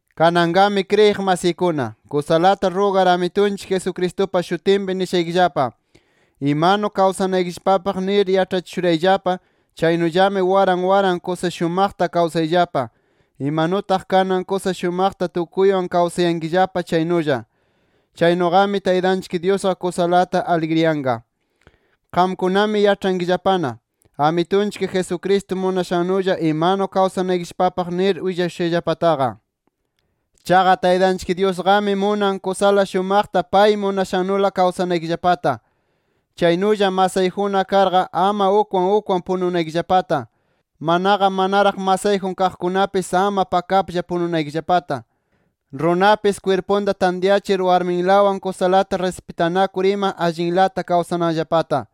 Kananqami kriyiq masiykuna, kusalata rugar Amitunchik Jesucristupa shutinpi nishaykillapa: Imanu kawsanaykillapapaq nir yaĉhachishurayllapa chaynullami waran waran kusa shumaqta kawsayllapa, imanutaq kanan kusa shumaqta tukuywan kawsayankillapa chaynulla. Chaynuqami Taytanchik Dyusqa kusalata aligriyanqa. Qamkunami yaĉhayankillapana, Amitunchik Jesucristo munashannulla imanu kawsanaykillapapaq nir willashushayllapataqa. Chaqa Taytanchik Dyusqami munan kusala shumaqta pay munashannula kawsanaykillapata, chaynulla masayjunna karqa, ama ukwan ukwan pununaykillapata, manaqa manaraq masayjun kaqkunapis, ama pakaplla pununaykillapata, runapis kwirpunta tantyachir, warminlawan kusalata rispitanakur ima, allinlata kawsananllapata.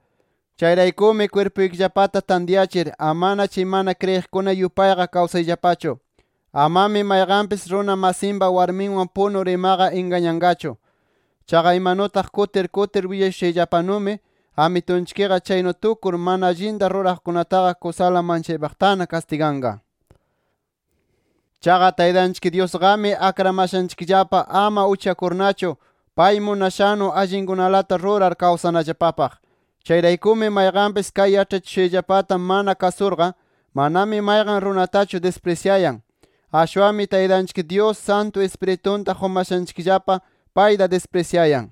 Chayraykumi kwirpuykillapata tantyachir, amana chay mana kriyiqkuna yupayqa kawsayllapachu. Amami mayqanpis runa masinpa warminwan punur imaqa ingañanqachu. Chaqa imanutaq kutir kutir willashushayllapanumi Amitunchikqa chaynu tukur mana allinta ruraqkunataqa kusala manchaypaqtana kastiganqa. Chaqa Taytanchik Dyusqami akramashanchikllapa ama uchakurnachu, pay munashannu allinkunalata rurar kawsanallapapaq. Chayraykumi mayqanpis kay yaĉhachishushayllapata mana kasurqa, manami mayqan runatachu disprisyayan. Ashwanmi Taytanchik Dyus, Santu Ispiritunta qumashanchikllapa, payta disprisyayan.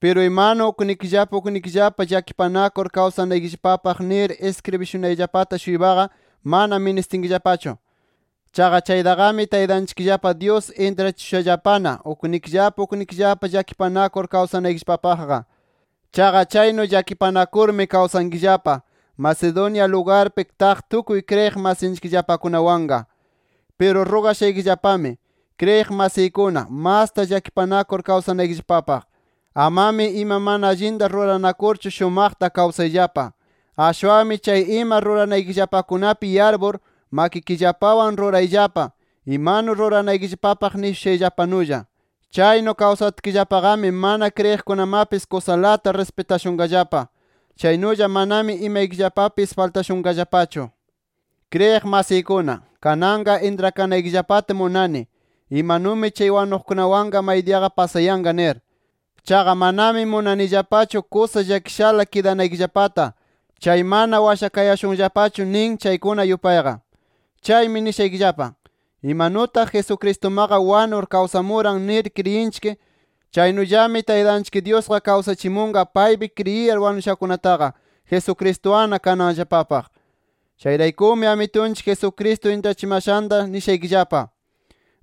Piru imanu uknikillapa uknikillapa llakipanakur kawsanaykillapapaq nir iskribishunayllapata-shuypaqa mana ministinkillapachu. Chaqa chaytaqami Taytanchikllapa Dyus intrachishushallapana uknikillapa uknikillapa llakipanakur kawsanaykillapapaqqa. Chaqa chaynu llakipanakurmi kawsankillapa, Macedonia lugarpi taq tukuy kriyiq masinchikllapakunawanqa. Piru rugashaykillapami kriyiq masiykuna, masta llakipanakur kawsanaykillapapaq. Amami ima mana allinta ruranakurchu shumaqta kawsayllapa. Ashwanmi chay ima ruranaykillapakunapi yarpur, makikillapawan rurayllapa, imanu ruranaykillapapaq nishushayllapanulla. Chaynu kawsatkillapaqami, mana kriyiqkunamapis kusalata rispitashunqallapa. Chaynulla manami imaykillapapis faltashunqallapachu. Kriyiq masiykuna, kananqa intrakanaykillapata munani, imanumi chay wanuqkunawanqa maydiyaqa pasayanqa nir. Chaqa manami munanillapachu kusa llakishala kidanaykillapata, chay mana washakayashunllapachu nin, chaykuna yupayqa. Chaymi nishaykillapa: Imanutaq Jesucristumaqa wanur, kawsamuran nir kriyinchik, chaynullami Taytanchik Dyusqa kawsachimunqa paypi kriyiyar wanushakunataqa, Jesucristuwanna kananllapapaq. Chayraykumi Amitunchik Jesucristo intrachimashanta nishaykillapa: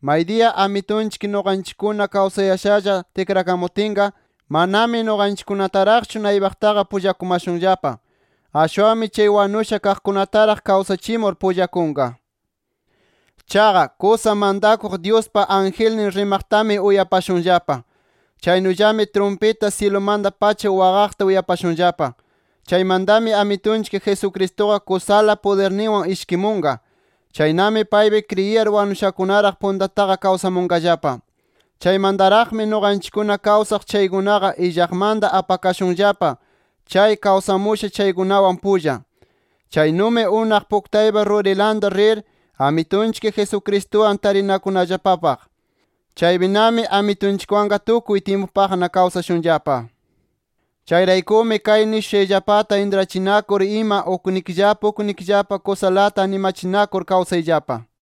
Maydiya Amitunchik nuqanchikkuna kawsayashalla tikrakamutinqa, manami nuqanchikkunataraqchu naypaqtaqa pullakumashunllapa. Ashwanmi chay wanusha kaqkunataraq kawsachimur pullakunqa. Chaqa, kusa mantakuq Dyuspa angelnin rimaqtami uyapashunllapa. Chaynullami trumpita syilumanta-pacha waqaqta uyapashunllapa. Chaymantami Amitunchik Jesucristuqa kusala pudirninwan ishkimunqa. Chaynami paypi kriyiyar wanushakunaraq puntataqa kawsamunqallapa. Chaymantaraqmi nuqanchikkuna kawsaq chaykunaqa illaqmanta apakashunllapa, chay kawsamusha chaykunawan pulla. Chaynumi unaq puktaypa rurilanta rir, Amitunchik Jesucristuwan tarinakunallapapaq. Chaypinami Amitunchikwanqa tukuy tyimpupaqna kawsashunllapa. Chayraykumi kay nishushayllapata intrachinakur ima uknikillapa uknikillapa kusalata animachinakur kawsayllapa.